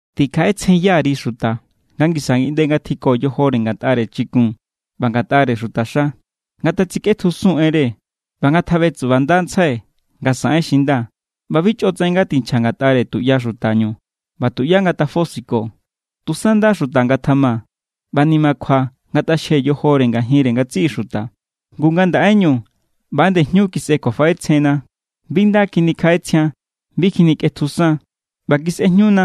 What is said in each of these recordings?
Tikjaꞌetsjenya_ri xuta nga ngisa ngiꞌnde ngatjiko yojore ngatꞌare chikun ꞌba ngatꞌare xutaxa. Ngatatsikꞌetjusun enre ꞌba ngatjaꞌbetsubandantsjai nga saꞌen xi nda. ꞌBa bi chꞌotsaꞌen ngatinchja ngatꞌare tuꞌya xutañu ꞌba tuꞌyá ngatafosiko. Tusa nda xuta ngatjama ꞌba nimakjua ngatꞌaxje yojore ngajinre ngatsiꞌi xuta. Ngu ngandaꞌeñu ꞌba=nde jñu kisꞌe kjuafaꞌetsjenna. Bi nda kjinikjaꞌetsjian, bi kjinikꞌetjusan, ꞌba kisꞌejñuna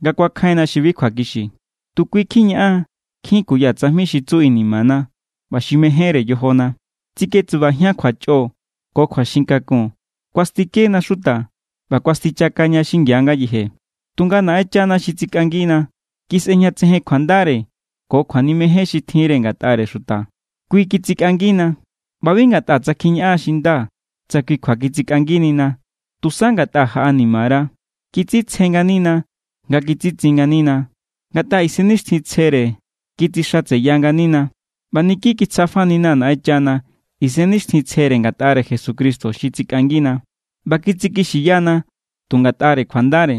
nga kuakjainna xi bi kjuakixi. Tu kui kjiñaꞌan nkjin kuya tsajmi xi tsu inimana ꞌba xi mejénre yojona. Tsiketsubajian kjuachꞌo ko kjuaxin kakun. Kuastikena xuta ꞌba kuastichakaña xingia ngayeje. Tunga Naꞌenchana xi tsikꞌangina kisꞌejñatsejen kjuandare ko kjuanimejen xi tjinre ngatꞌare xuta. Kui kitsikꞌangina. ꞌBa bi ngatꞌa tsa kjiñaꞌan xi nda tsa kui kjua kitsikꞌanginina, tusa ngatꞌa jaꞌanima_ra̱. Kitsitsje nganina nga kitsitsin nganina. Ngatꞌare Isennixtjintsjere kitsixatseya nganina. ꞌBa niki kitsjafanina= Naꞌenchana Isennixtjintsjere ngatꞌare Jesucristo xi tsikꞌangina. ꞌBa kitsikixiyana tu ngatꞌare kjuandare,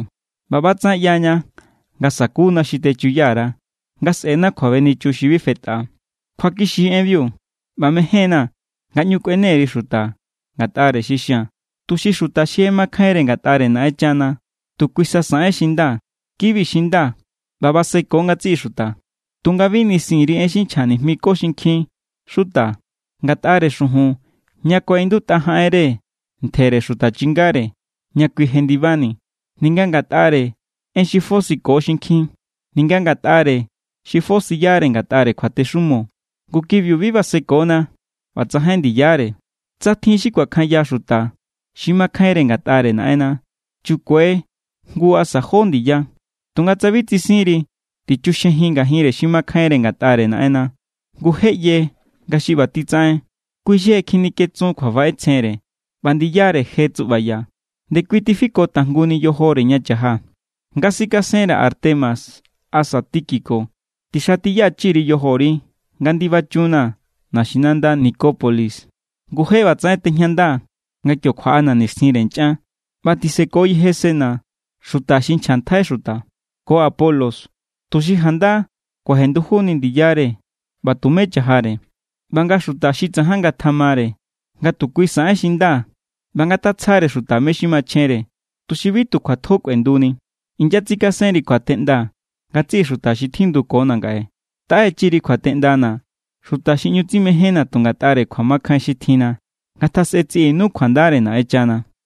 ꞌba ꞌbatsaꞌen ꞌyaña nga sakuna xi techuya_ra, nga sꞌe̱na kjuabenichun xi bi fetꞌa. Kjuakixi= enbiu ꞌba mején=na̱ nga ꞌñu kꞌuene_ri xuta ngatꞌare xi xia̱n, tuxi xuta xi je makjainre ngatꞌare Naꞌenchana tu kui sa saꞌen xi nda. Ki=bi xi nda ꞌba baseko ngatsiꞌi xuta. Tunga bi nisin_ri en si xi nchja nijmiko xinkjin xuta ngatꞌare xujun ña kuaꞌindutꞌa jaꞌenre ntjere xuta chingare ña kui jendibani, ninga ngatꞌare en xi fosiyako xinkjin, ninga ngatꞌare xi fosiyare ngatꞌare kjuatexumo. Ngu kibiu bi basekona ꞌba tsajain ndiyare. Tsa tjin xi kuakjanya xuta xi makjainre ngatꞌare Naꞌenna, chukue jngu asa jó ndiya. Tunga tsa bi tsisinri, tichuxjejin ngajinre xi makjainre ngatꞌare Naꞌenna. Ngu je ꞌye nga xi ꞌba titsaꞌen, kui xi je kjinikjetsun kjuafaꞌetsjenre ꞌba ndiyare je tsuꞌbaya. Nde kui tifiko tajnguni yojore ña cha̱jaa̱. Nga sikasenra̱ Artemas asa Tíquico, tixatiyachiri yojori nga ndibachunnaa̱ naxinanda Nicópolis. Ngu je ꞌbatsaꞌen tejñandaa̱ nga kio kjuaꞌana̱ nixtjinre nchꞌan. ꞌBa tisekoyeje Zenas, xuta xi nchjantjai xuta, ko Apolos, tuxi janda kuajendujuni ndiyare ꞌba tumé chajare. ꞌBa nga xuta xi tsajan ngatjamare nga tu kui saꞌen xi nda ꞌba ngatatsjare xuta mé= xi machjenre, tuxi bi tu kjuatjo kꞌuenduni. Inyatsikasenri kjuateꞌnda ngatsiꞌi xuta xi tjindukona̱ ngaꞌe. Taꞌechi_ri kjuateꞌndana̱ xuta xi ꞌñu tsimejénna tu ngatꞌare kjuamakjain xi tjinna. Ngatjasꞌe tsiꞌinu kjuandare Naꞌenchana.